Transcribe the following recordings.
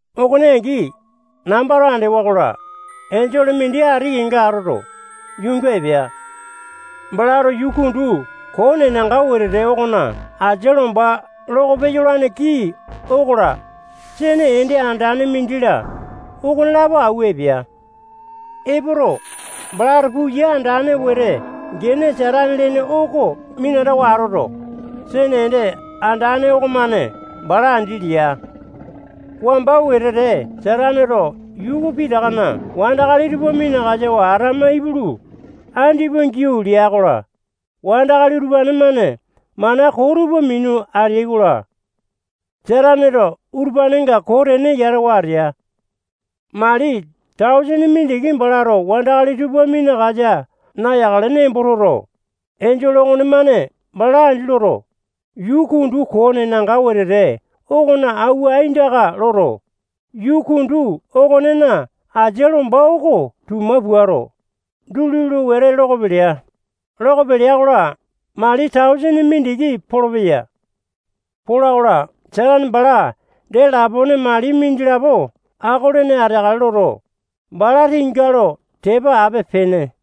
Okone angi, nambato andewa-kola, enjole mindi ati kenga atoto, yuunga epea. Balato yuu kundu koo nenanga wetete okona asia lomba loko peyolane kii okola, sene ende andane mindi-la, okonelapo auwa epea. Epoto, balato puya andane wete gene Satane lene oko minatawa atoto, sene ende andane okomane bala andi lea. Wamba wetete Sataneto yuu pitakana wandakali tupa minakasawa atama ipulu, andipa giau lea-kola, wandakali utupane-mane mana koo tupa minu ateai-kola, Sataneto utupanenga koo tene yatawa atea. Mali tausene mindiki balato wandakali tupa minakasa nayakale nembo toto, enjole okonemane bala andi loto, yuu kundu koo nenanga wetete okona auwa aindaka loto, yuu kundu okonena asia lomba oko tuma puato, duli lo wete loko pelea. Loko pelea-kola, mali tausene mindiki polopeya. Pola-kola, Satane bala dee lapone mali mindilapo ako-lene ateakale loto, bala tinga lo tepa ape-pene.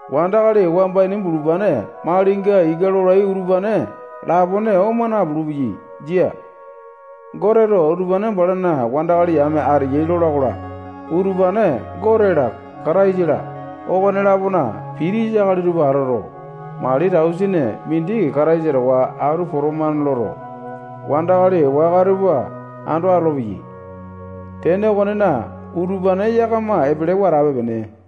Wandakali wamba ini bulupane malinga ika lolai utupane lapone oma napulu-peyai. Jia. Goteto utupane balana wandakali yame ateyai lola-kola, utupane Gote-la, Katisa-la, okone-lapona pitisa akali tupa atoto, mali tausene mindi Kataisa towa atu potomane loto, wandakali waka tupa ando atolopeyai. Tene okonena, utupane yakama epelewa atape-pene.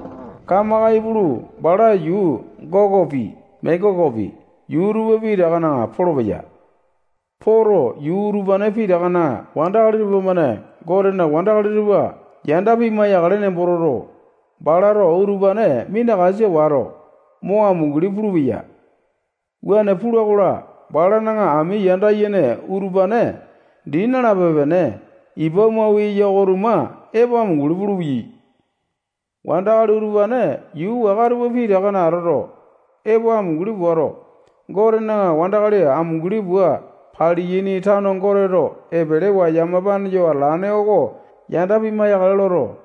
Kamaka ipulu, bala yuu Gokopi, Mekokopi, yuu tupa pitakana polopeya. Poto, yuu utupane pitakana wandakali tupamane Gotena wandakali tupa yanda pimai-yakale nembo toto, balato utupane minakasa wato, mo amunguli pulupeya. Wuane pula-kola, balana ami yanda yene utupane dii nalape-pene ipa mau eya oko-tuma epo amunguli pulupeyai. Wandakali utupane yuu waka tupa pitakana atoto, epo amunguli puato, Gotena wandakali amunguli pua paliyaini tano Goteto epelewa yamapane yo atalane oko yanda pimai-yakale loto,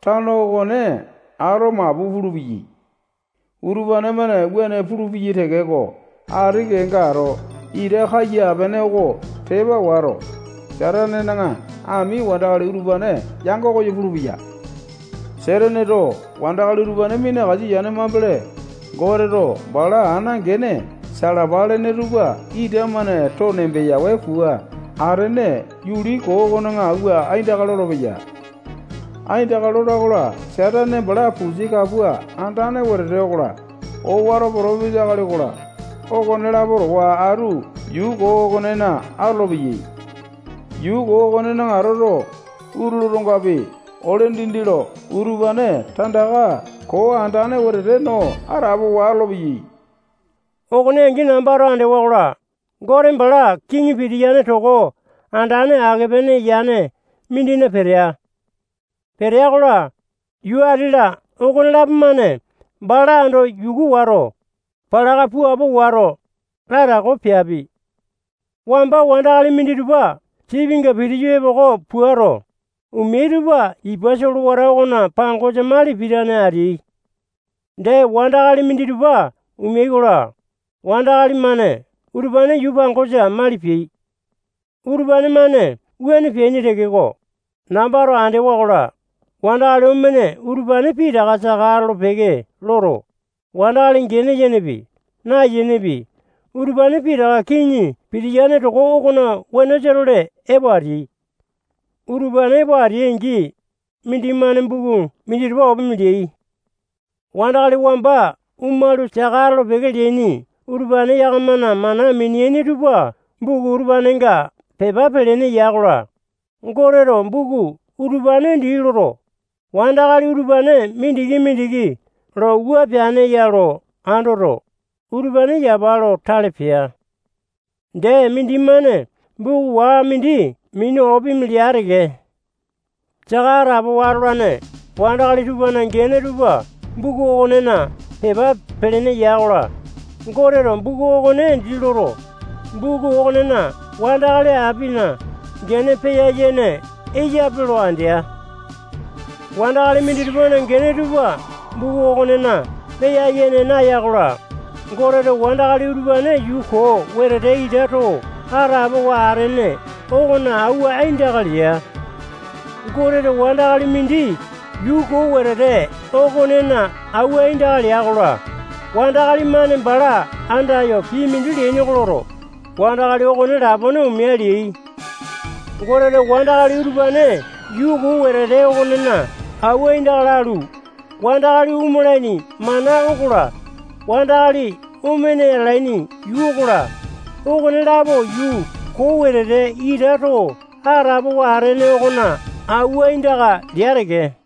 tano okone ato mapu pulupeyai. Utupane-mane wuane pulupeyai tekeko, ati kenga ato ita kaiya-pene oko tepa wato, Satanena ami wandakali utupane yango koyo pulupeya. Sataneto wandakali utupane minakasa yane mambele, Goteto bala ana gene salapa lene tupa ita-mane too nembeyawe pua atene yuli koo okona auwa aindaka lolopeya. Aindaka lola-kola, Satane bala pusi kapua andane wetete okola, owato potopesa akali okola, okonelapo towa atu yuu koo okonena atolopeyai. Yuu koo okonena atoto, utulu otongapi, ole dindi lo utupane tandaka koo andane wetete no atapowa atolopeyai. Okone angi nambato andewa-kola, Gote bala kiŋi pitiyane toko andane ake-pene yane mindina petea. Petea-kola, yuu ati-la okonelapo-mane bala ando yuku wato, palaka puapo wato, latako peapi. Wamba wandakali minditupa sipinga pitiyu epoko puato, omeai tupa ipa solewata okona pangosa mali pitane ateai. Dee, wandakali minditupa omeai-kola, wandakali-mane utupane yuu pangosa mali peai. Utupane-mane wuane peaini tekeko, nambato andewa-kola, wandakali omene utupane pitaka saka atolo-peke loto, wandakali gene yenepi, nayenepi, utupane pitaka kiŋi pitiyane toko okona wenosa-tole epo ateai. Utupane epo ateai-angi, mindimane buku minditupa opimi leai. Wandakali wamba omalu, saka atolo-peke leaini utupane yakamana mana mineaini tupa buku utupanenga pepa pelene ya-kola, Goteto buku utupane dii loto, wandakali utupane mindiki-mindiki lo wua peane ya lo andoto, utupane yapa lo tale pea. Dee, mindimane buku waka mindi minu opimi lea teke. Saka atapowa atolane wandakali tupana gene tupa buku okonena pepa pelene ya-kola, Goteto buku okone dii loto, buku okonena wandakali apina gene peya-yene eyape lo andea. Wandakali minditupana gene tupa buku okonena peya-yene naya-kola, Goteto wandakali utupane yuu koo wetete ita too atapowa atene okona auwa aindaka lea. Goteto wandakali mindi yuu koo wetete okonena auwa aindaka lea-kola, wandakali-mane bala andayo pii mindi leaini oko loto, wandakali okone lapone omea leai. Goteto wandakali utupane yuu koo wetete okonena auwa aindaka lalu, wandakali omalaini mana okola, wandakali omene atalaini yuu okola, okonelapo yuu koo wetete ita too atapowa atene okona auwa aindaka lea teke.